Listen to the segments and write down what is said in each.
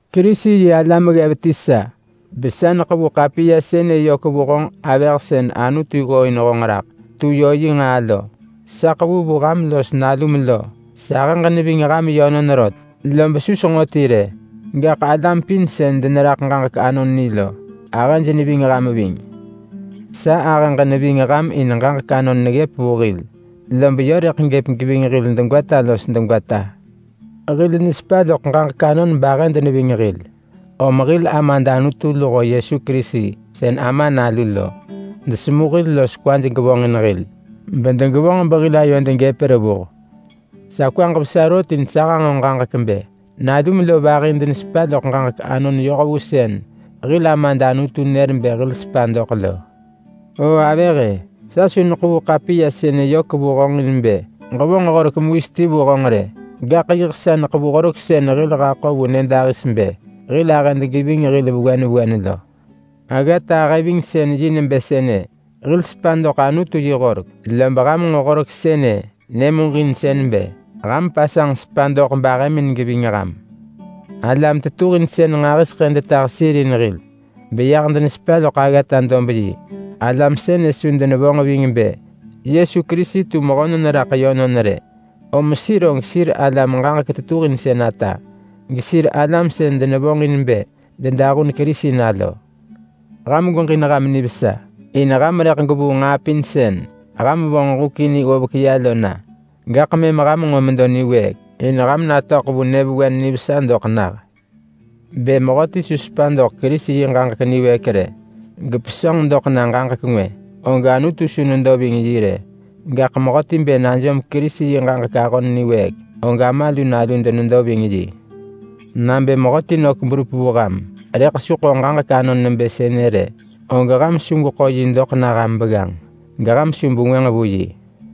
Kerisi-yi-alam hir ggev ti sa, besa neḳevu ḳapiya sënë yök vu honġ avëh sën Anutu ggooin honġ raḳ tu yö yi nġaa lo. Sa ḳevu vu ham los nalum lo. Sahëġ neving ham yönon rot, lob su senġo ti rë, gaḳ alam pin sën deneraḳ ġaġek anon ni lo ahëj neving ham ving. Sa ahëġ neving ham in ġaġek anon neggëp vu hil, lob yö rëḳ gëp geving hil degwata los degwata. Hil nesepa loḳ ġaġek anon bahëd neving hil. Om hil Amad Anutu luho Yesu Kerisi sën Ama Nalu lo desemu hil los kwaj gevonġin hil bedegevonġ behil ayod gëp revuh. Sa kwaġ vesa rot in sa hanġo ġaġek bë nalum lo vahi denesepa loḳ ġaġek anon yoh vu sën hil Amad Anutu nër bë hil sepa doḳ lo. Oo avëh-e! Sa su neḳevu ḳapiya sënë yök vu honġ in bë ġevonġ horek mewis ti vu honġ rë. Gaḳ yiḳ sa neḳevu horek sën hil haḳo vu nyëdahis bë hil ahëd geving hil vewen vewen lo. Aggata ahëvingsën-yi nebë sënë: Hil sepa doḳ Anutu yi horek. Lob ham nġo horek sënë nyëmuġinsën bë ham pasanġ sepa doḳ bahëmin geving ham. Alam tetuhinsën nġahiseḳë detah sir in hil beyah denesepa loḳ aggata-dob-yi. Alam sënë su denevonġ ving bë Yesu Kerisi tu mehönon raḳ yönon rë, om sir og sir alam ġaġek tetuhinsën ata, gesir alam sën denevonġin bë dedahun Kerisi na lo. Ham gweġin ham nivesa in ham rëḳ gwevuu nġaa pin sën ham vonġ huk in ggovek ya lo na. Gaḳ mëm ham nġo medo niwëëk in ham natöḳ vu nyëvewen nivesa doḳ nah. Bë mehöti su sepa doḳ Kerisi yi ġaġek niwëëk rë, gepesönġ loḳ ya ġaġek ngwë, og Anutu su nedo ving yi rë. Gaḳ mehöti bë najom Kerisi yi ġaġek ahon niwëëk, og Ama lu Nalu denedo ving yi. Nabë mehöti nök berup vu ham, rëḳ su ḳo ġaġek anon nebë sënë rë, og ham su gweḳo yi doḳ na ham begganġ, geham su bengwënġ vu yi.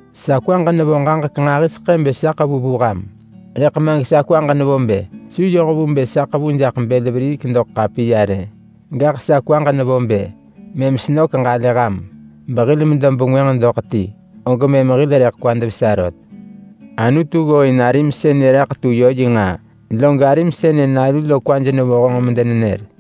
Sa kwaġ nevo ġaġek nġahiseḳë bë sa ḳevu vu ham, rëḳ ma gesa kwaġ nevo bë su yoh vu bë sa ḳevu jaḳ bël veriik doḳ ḳapiya rë. Gaḳ sa kwaġ nevo bë mëm senök ġalë ham behil medo bengwënġ doḳ ti, og mëm hil rëḳ kwad vesa rot. Anutu ggooin arim sënë raḳ tu yö yi nġaa, log arim sënë nalu lo kwaj nevo honġ medenenër.